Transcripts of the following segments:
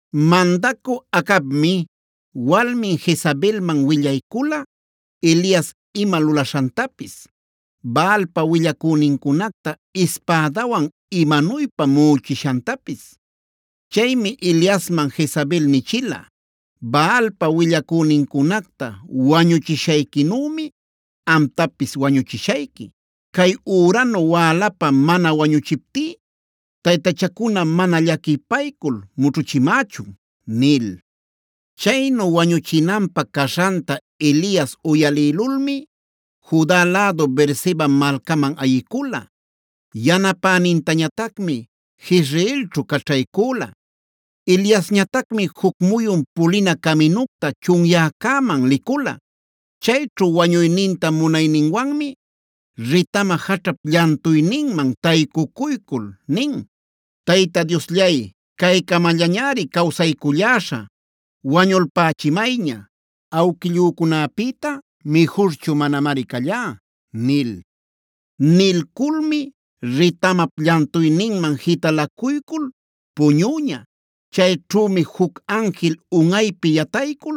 Mandacü Acabmi walmin Jezabelman willaycula Elias ima lulaśhantapis, Baalpa willacünincunacta ispädawan imanuypa muꞌuchishantapis. Chaymi Eliasman Jezabel nichila: “Baalpa willacünincunacta wañuchishayquinümi amtapis wañuchishayqui. Cay üranu wälapa mana wañuchiptí taytachacuna mana llaquipaycul mućhuchimächun” nil. Chaynu wañuchinanpä caśhanta Elias uyalïlulmi Juda lädu Beerseba malcaman ayicula. Yanapänintañatacmi Jezreelćhu caćhaycüla. Eliasñatacmi juc muyun pulina caminucta chunyäcäman licula. Chayćhu wañuyninta munayninwanmi ritama jaćhap llantuyninman taycucuycul nin: “Tayta Diosllay, caycamallañari cawsayculläśhä; wañulpächimayña. Awquillücunapïta mijurchu manamari callá” nil. Nilculmi ritamap llantuyninman jitalacuycul puñüña. Chayćhümi juc anjil unꞌaypi yataycul: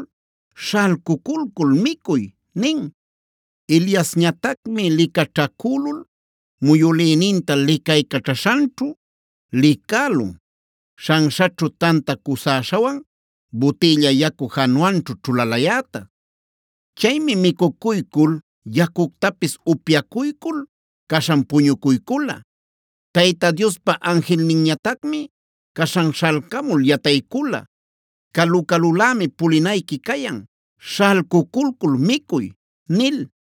“Śhalcuculcul micuy” nin. Eliasñatacmi licaćhacülul muyülïninta licaycaćhaśhanćhu licälun, śhanśhaćhu tanta cusäśhawan butïlla yacu jawnanćhu ćhulalayäta. Chaymi micucuycul, yacuctapis upyacuycul caśhan puñucuycula. Tayta Diospa anjilninñatacmi caśhan śhalcamul yataycula: “Calu-calulämi pulinayqui cayan; śhalcuculcul micuy” nil.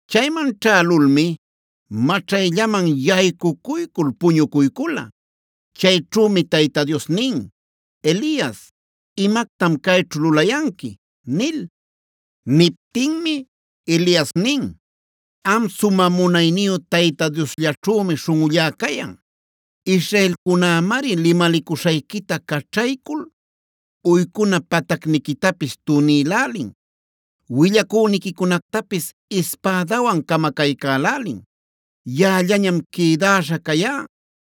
Chayman ćhälulmi maćhayllaman yaycucuycul puñucuycula. Chayćhümi Tayta Dios nin: “Elias, ¿imactam cayćhu lulayanqui?” nil. Niptinmi Elias nin: “Am sumä munayniyu Tayta Dioslläćhümi śhunꞌullá cayan. Israelcunämari limalicuśhayquita caćhaycul uycuna patacniquitapis tunïlälin, willacüniquicunactapis ispädawan camacaycälälin. Yaꞌallañam quïdäśha cayá;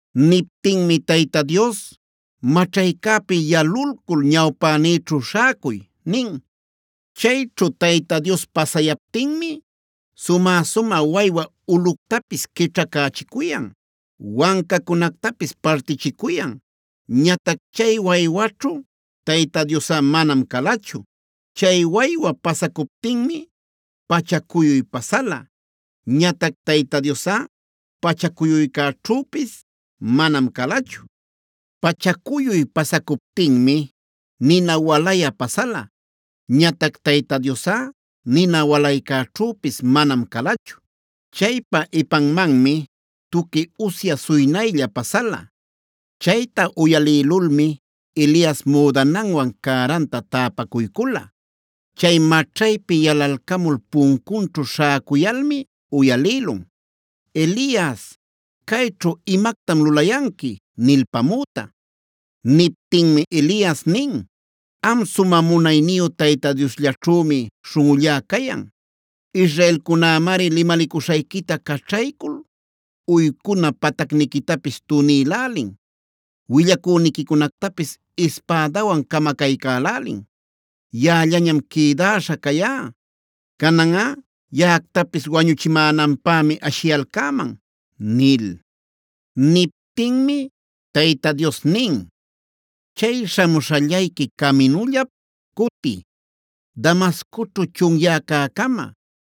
Niptinmi Tayta Dios: “Maćhaycäpi yalulcul ñawpänïćhu śhäcuy” nin. Chayćhu Tayta Dios pasayaptinmi sumä-sumä waywa ulꞌuctapis quićhacächicuyan, wancacunactapis partichicuyan. Ñatac chay waywaćhu Tayta Diosꞌa manam calachu. Chay waywa pasacuptinmi pachacuyuy pasala. Ñatac Tayta Diosꞌa pachacuyuycäćhüpis manam calachu. Pachacuyuy pasacuptinmi nina walayä pasala. Ñatac Tayta Diosꞌa nina walaycäćhüpis manam calachu. Chaypa ipanmanmi tuqui ushya suynaylla pasala. Chayta uyalïlulmi Elias müdananwan cäranta täpacuycula. Chay maćhaypi yalalcamul puncunćhu śhäcuyalmi uyalïlun: “Elias, ¿cayćhu imactam lulayanqui?” nilpamüta. Niptinmi Elias nin: “Am sumä munayniyu Tayta Diosllaćhümi śhunꞌullá cayan. Israelcunämari limalicuśhayquita caćhaycul uycuna patacniquitapis tunïlälin, willacüniquicunactapis ispädawan camacaycälälin. Yaꞌallañam quïdäśha cayá; cananꞌa yaꞌactapis wañuchimänanpämi ashiyalcäman” nil. Niptinmi Tayta Dios nin: “Chay śhamuśhallayqui caminullap cutiy, Damascoćhu chunyäcäcama.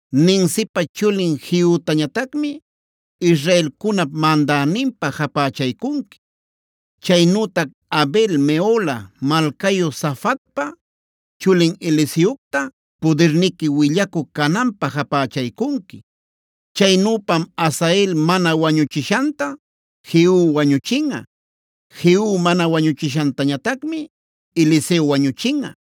Nimsipa chulin Jehutañatacmi israelcunap mandäninpä japächaycunqui.c Chaynütac Abel-mehola malcayu Safatpa chulin Eliseocta pudirniqui willacü cananpä japächaycunqui. Chaynüpam Hazael mana wañuchishanta Jehu wañuchinꞌa. Jehu mana wañuchishantañatacmi Eliseo wañuchinꞌa.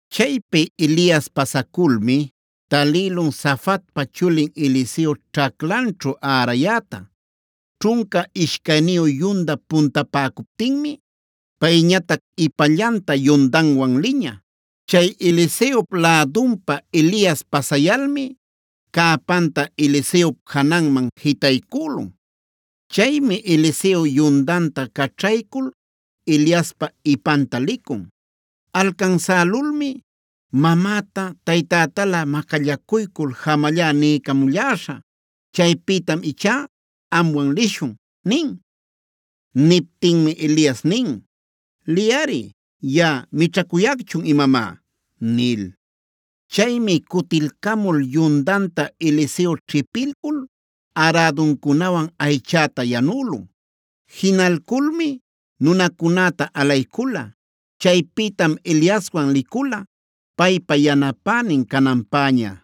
Chaypi Elias pasaculmi talïlun Safatpa chulin Eliseo ćhaclanćhu ärayäta. Ćhunca ishcayniyu yunda puntapäcuptinmi payñatac ipallanta yundanwan liña. Chay Eliseop lädunpa Elias pasayalmi cäpanta Eliseop jananman jitaycülun. Chaymi Eliseo yundanta caćhaycul Eliaspa ipanta licun. Alcansälulmi: “Mamäta taytätalä macallacuycul ‘jamallá’ niycamulläśhä; chaypïtam ichá amwan lishun” nin. Niptinmi Elias nin: “Liyꞌari. ¿Yaꞌa mićhacuyacchu imamá?” nil. Chaymi cutilcamul yundanta Eliseo ćhipilcul äraduncunawan aychäta yanülun. Jinalculmi nunacunäta alaycula. Chaypïtam Eliaswan licula paypa yanapänin cananpäña.